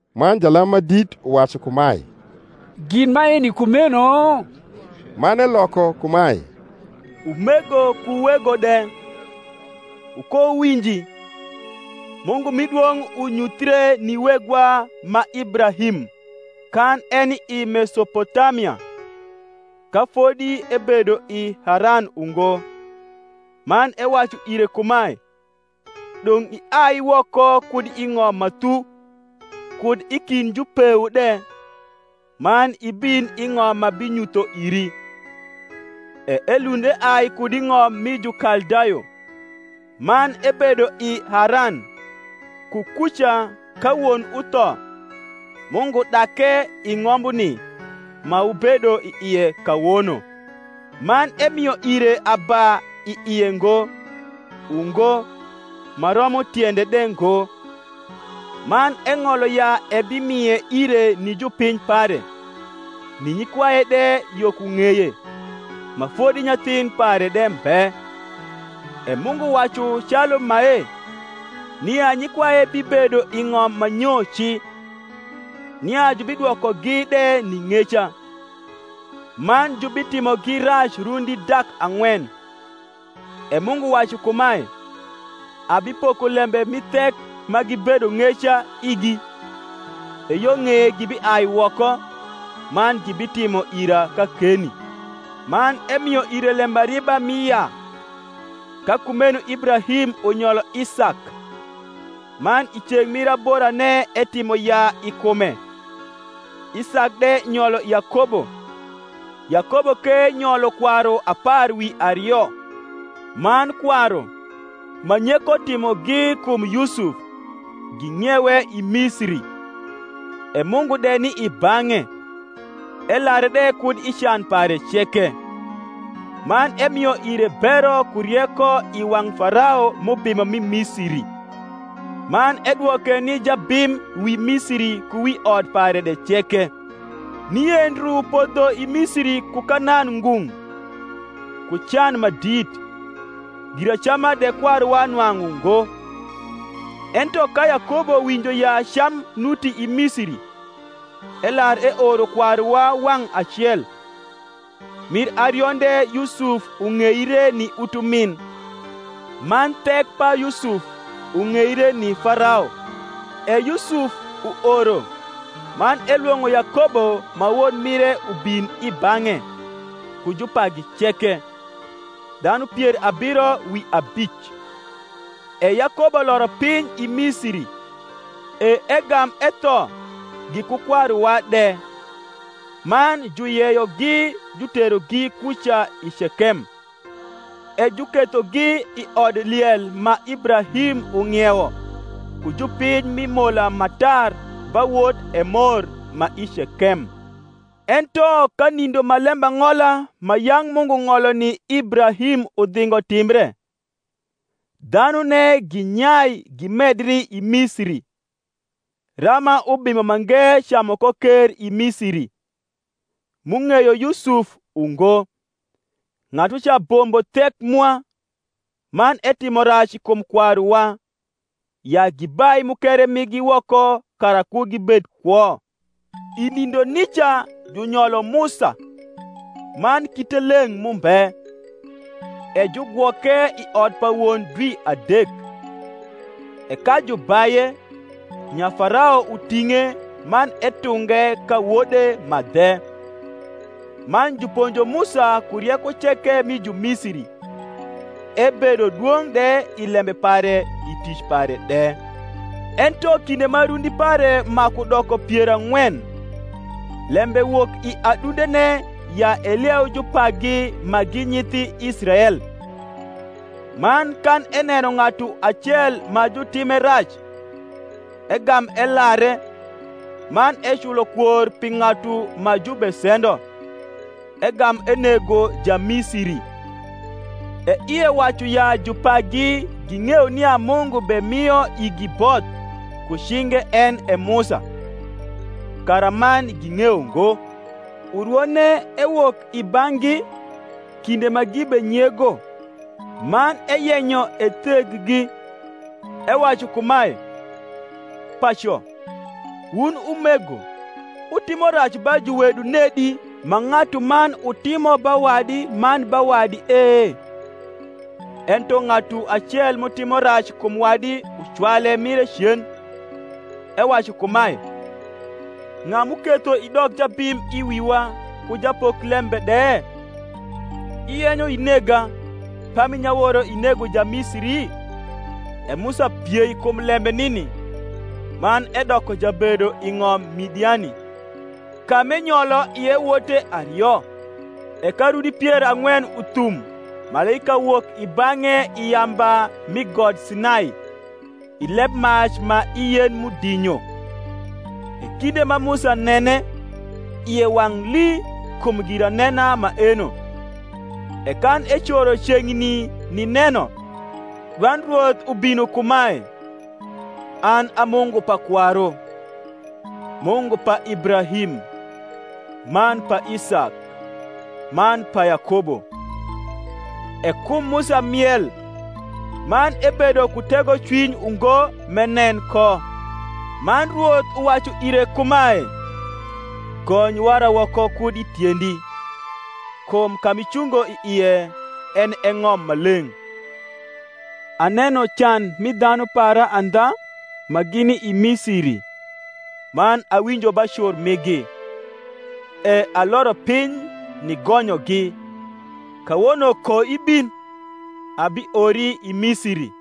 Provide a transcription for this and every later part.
Man jalam ma dit uwacu kumae, Gin maeni kumeno? Man eloko kumae, Umego ku wego de, wukowuwinji: Mungu mi dwong’ unyuthie ni wegwa ma Ibrahim, kan eni i Mesopotamia, ka fodi ebedo i Haran ungo, man ewacu ire kumae, Dong’ iai woko kud i ng’om ma thu, kud i kind jupeu de, man ibin i ng’om m’abinyutho iri. E elund eai kud i ng’om mi Jukaldayo, man ebedo i Haran: ku kuca, ka won utho, Mungu dake i ng’ombuni, ma wubedo i ie kawono: man emio ire aba i ie ngo, ungo, ma romo tiende de ngo: man eng’olo ya ebimie ire ni jupiny pare, ni nyikwaye de yo ku ng’eye, ma fodi nyathin pare de mbe. E Mungu wacu calu mae, nia nyikwaye bibedo i ng’om ma nyo ci, nia jubidwokogi de ni ng’eca, man jubitimogi rac rundi dak ang’wen. E Mungu wacu kumae, Abipoko lembe mi thek ma gibedo ng’eca igi: e yo ng’eye gibiai woko, man gibitimo ira kakeni. Man emio ire lembariba mi yaa: ka kumeno Ibrahim unyolo Isak, man i ceng’ mir aborane etimo yaa i kume; Isak de nyolo Yakobo, Yakobo ke nyolo kwaru apar wi ario. Man kwaru, ma nyeko timogi kum Yusuf, ging’iewe i Misiri; e Mungu de ni i bang’e, elare de kud i can pare ceke, man emio ire bero ku rieko i wang’ Farao m’ubimo mi Misiri; man edwoke ni jabim wi Misiri ku wi ot pare de ceke. Nie ndru podho i Misiri ku Kanan ngung’, ku can ma dit. Giracama de kwaruwa nwang’u ngo. Ento ka Yakobo winjo ya cam nuti i Misiri, elar eoro kwaruwa wang’ acel. Mir arionde Yusuf ung’eire ni utumin; man thek pa Yusuf ung’eire ni Farao. E Yusuf uoro, man elwong’o Yakobo ma won mire ubin i bang’e, ku jupagi ceke, dhanu pier abiro wi abic. E Yakobo loro piny i Misiri; e egam etho, giku kwaruwa de; man juyeyogi juterogi kuca i Cekem, e jukethogi i odliel ma Ibrahim ung’iewo ku jupiny mi mola ma tar ba wot Emor ma i Cekem. Ento ka nindo ma lembang’ola ma yang’ Mungu ng’olo ni Ibrahim udhingo timbre, dhanune ginyai gimedri i Misiri, rama ubimo mange camu ko ker i Misiri, m’ung’eyo Yusuf ungo. Ng’atuca bombo thek mwa, man etimo rac kum kwaruwa, ya gibai mukere migi woko kara ku gibed kwo. I nindo nica junyolo Musa, man kite leng’ mumbe; e jugwoke i ot pa won dwi adek: e ka jubaye, nya Farao uting’e, man etunge ka wode ma dhe. Man juponjo Musa ku rieko ceke mi Jumisiri; ebedo dwong’ de i lembe pare i tic pare de. Ento kinde ma rundi pare maku doko pier ang’wen, lembe wok i adundene ya elieu jupagi ma gi nyithi Israel. Man kan eneno ng’atu acel ma jutime rac, egam elare, man eculo kwor pi ng’atu ma jubesendo, egam enego Jamisiri: e ie wacu ya jupagi ging’eyo nia Mungu bemio igi both ku cinge en e Musa; karaman ging’eyo ngo. Urwone ewok i bang’gi kinde ma gibenyego, man eyenyo etheggi, ewacu kumae, Paco, wun umego; wutimo rac ba juwedu nedi ma ng’atuman utimo ba wadi man ba wadi e? Ento ng’atu acel m’utimo rac kum wadi ucwale mire cen, ewacu kumae, Ng’a m’uketho idok jabim i wiwa ku japoklembe de? Iyenyo inega, pami nyaworo inego Jamisiri? E Musa piei kum lembe nini, man edoko jabedo i ng’om Midiani, ka m’enyolo ie wote ario. E ka rundi pier ang’wen uthum malaika wok i bang’e i yamba mi got Sinai, i lebmac ma i yen m’udinyo. E kinde ma Musa nene, ie wang’ lii kum giranena maeno: e kan ecoro ceng’ni nineno, dwand Rwoth ubino kumae, An a Mungu pa kwaru, Mungu pa Ibrahim, man pa Isak, man pa Yakobo. E kum Musa miel, man ebedo ku tegocwiny ungo m’enen ko. Man Rwoth uwacu ire kumae, Gony wara woko kud i tiendi: kum ka m’icungo i ie en e ng’om ma leng’. Aneno can mi dhanu para andha ma gini i Misiri, man awinjo ba cur migi, e aloro piny nigonyogi: kawono koibin, abiori i Misiri.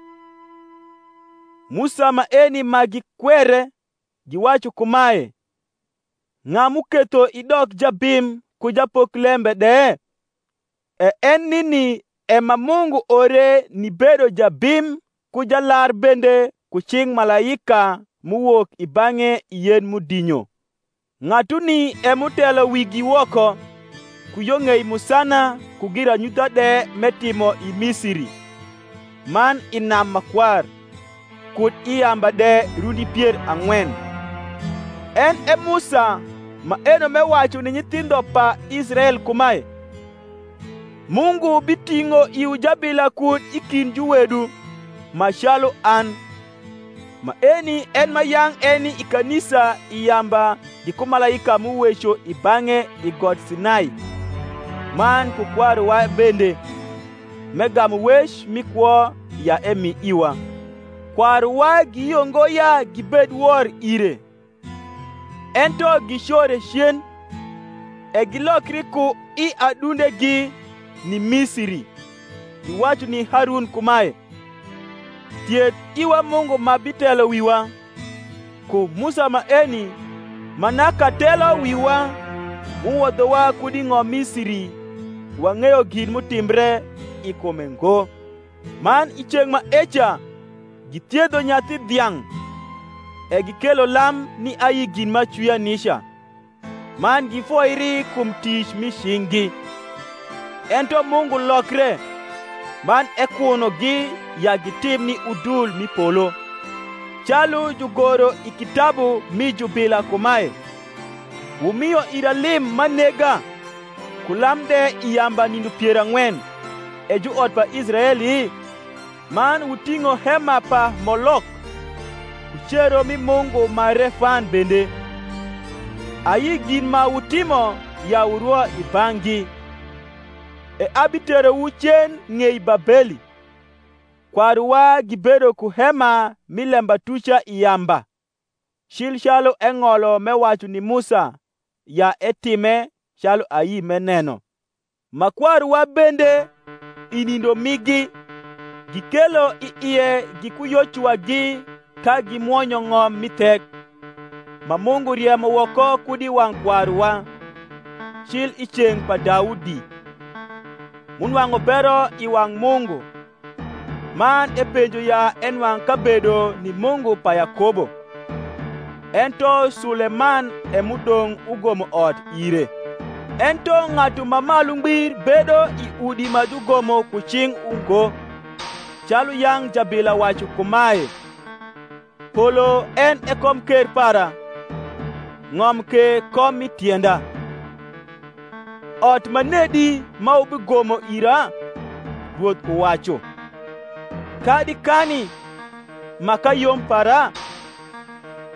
Musa maeni ma gikwere, giwacu kumae, Ng’a m’uketho idok jabim ku japoklembe de? e en nini e ma Mungu ore nibedo jabim ku jalar bende ku cing’ malaika m’uwok i bang’e i yen m’udinyo. Ng’atuni e m’utelo wigi woko, ku yo ng’ei musana ku giranyutha de m’etimo i Misiri, man i nam Makwar, kud i yamba de rundi pier ang’wen. En e Musa maeno m’ewacu ni nyithindho pa Israel kumae, Mungu biting’o iwu jabila kud i kind juwedu, ma calu an. Maeni en ma yang’ eni i kanisa i yamba giku malaika m’uweco i bang’e i got Sinai, man ku kwaruwa bende: m’egamu wec mi kwo ya emi iwa: kwaruwa giyio ngo ya gibed wor ire, ento gicore cen, e gilokri ku i adundegi ni Misiri, giwacu ni Harun kumae, Thiedh iwa mungu ma bitelo wiwa: kum Musa maeni, ma naka telo wiwa m’uwodhowa kud i ng’om Misiri, wang’eyo gin m’utimbre i kume ngo. Man i ceng’ maeca githiedho nyathi dhiang’, e gikelo lam ni ayi gin m’acwia nica, man gifoiri kum tic mi cing’gi. Ento Mungu lokre, man ekunogi ya gitim ni udul mi polo; calu jugoro i kitabu mi jubila kumae, Wumio ira lim m’anega ku lam de I yamba nindo pier ang’wen, E juot pa Israeli? Man wuting’o hema pa Molok, Ku cero mi mungu ma Refan bende, Ayi gin ma wutimo ya wurwo i bang’gi: E abiterowu cen ng’ei Babeli. Kwaruwa gibedo ku hema mi lembatuca i yamba, cil calu eng’olo m’ewacu ni Musa, ya etime calu ayi m’eneno. Ma kwaruwa bende, i nindo migi, gikelo i ie giku Yocuwagi ka gimwonyo ng’om mi thek, ma Mungu riemo woko kud i wang’ kwaruwa, cil i ceng’ pa Daudi; m’unwang’u bero i wang’ Mungu, man epenjo ya enwang’ kabedo ni Mungu pa Yakobo. Ento Suleman e m’udong’ ugomo ot ire. Ento Ng’atu ma Malu Ngbir bedo i udi ma jugomo ku cing’ ungo; calu yang’ jabila wacu kumae, Polo en e komker para, Ng’om ke kom mi tienda: Ot manedi ma wubigomo ira? Rwoth uwacu: Kadi kani ma kayom para?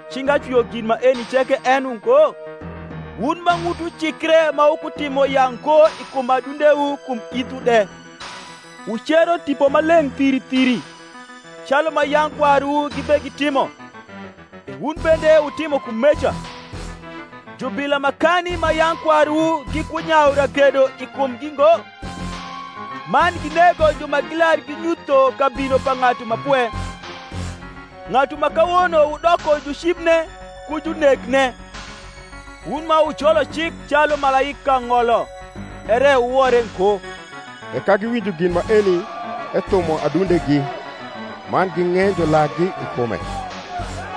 Cinga cwio gin maeni ceke en ungo? Wun ma ng’utwu cikre ma wukuti mo yaa ngo kum adundewu kum ithwu de, wucero Tipo Maleng’ thiri thiri: calu ma yang’ kwaruwu gibegitimo, e wun bende wutimo kumeca. Jubila makani ma yang’ kwaruwu gikunyayu ragedo i kumgi ngo? man ginego ju ma gilar ginyutho kabino pa Ng’atu ma Pwe; ng’atu ma kawono wudoko jucibne ku junekne; wun ma wujolo cik calu malaika ng’olo, ere wuwore ngo. E ka giwinjo gin maeni ethumo adundegi, man ging’enjo lakgi i kume.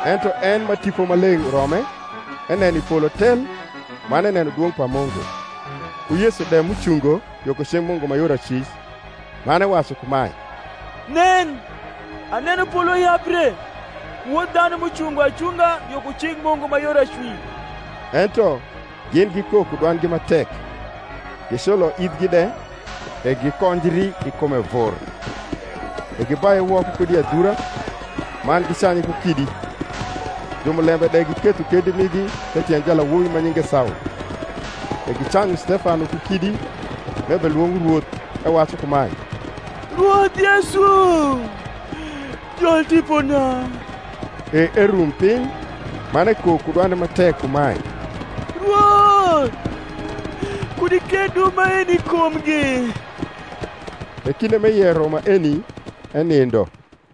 Ento en, ma Tipo Maleng’ urome, eneno i polo tel, man eneno dwong’ pa Mungu, ku Yesu de m’ucungo yo ku cing’ Mungu ma yor acwic, man ewacu kumae, Nen, aneno polo yabre, ku Wod dhanu m’ucungo acunga yo ku cing’ Mungu ma yor acwic. Ento gin gikok ku dwandgi ma tek, giculo ithgi de, e gikonjri i kume vur; e gibaye woko kud i adhura, man gicanye ku kidi: jumulembe de giketho kendi migi the tiend jalawobi ma nyinge Saul. E gicanyu Stefano ku kidi, m’ebelwong’o Rwoth, ewacu kumae, Rwoth Yesu, jol tipona. E erum piny, man ekok ku dwande ma tek kumae, Rwoth, kud iketh dubo maeni i kumgi. E kinde m’eyero maeni, enindo.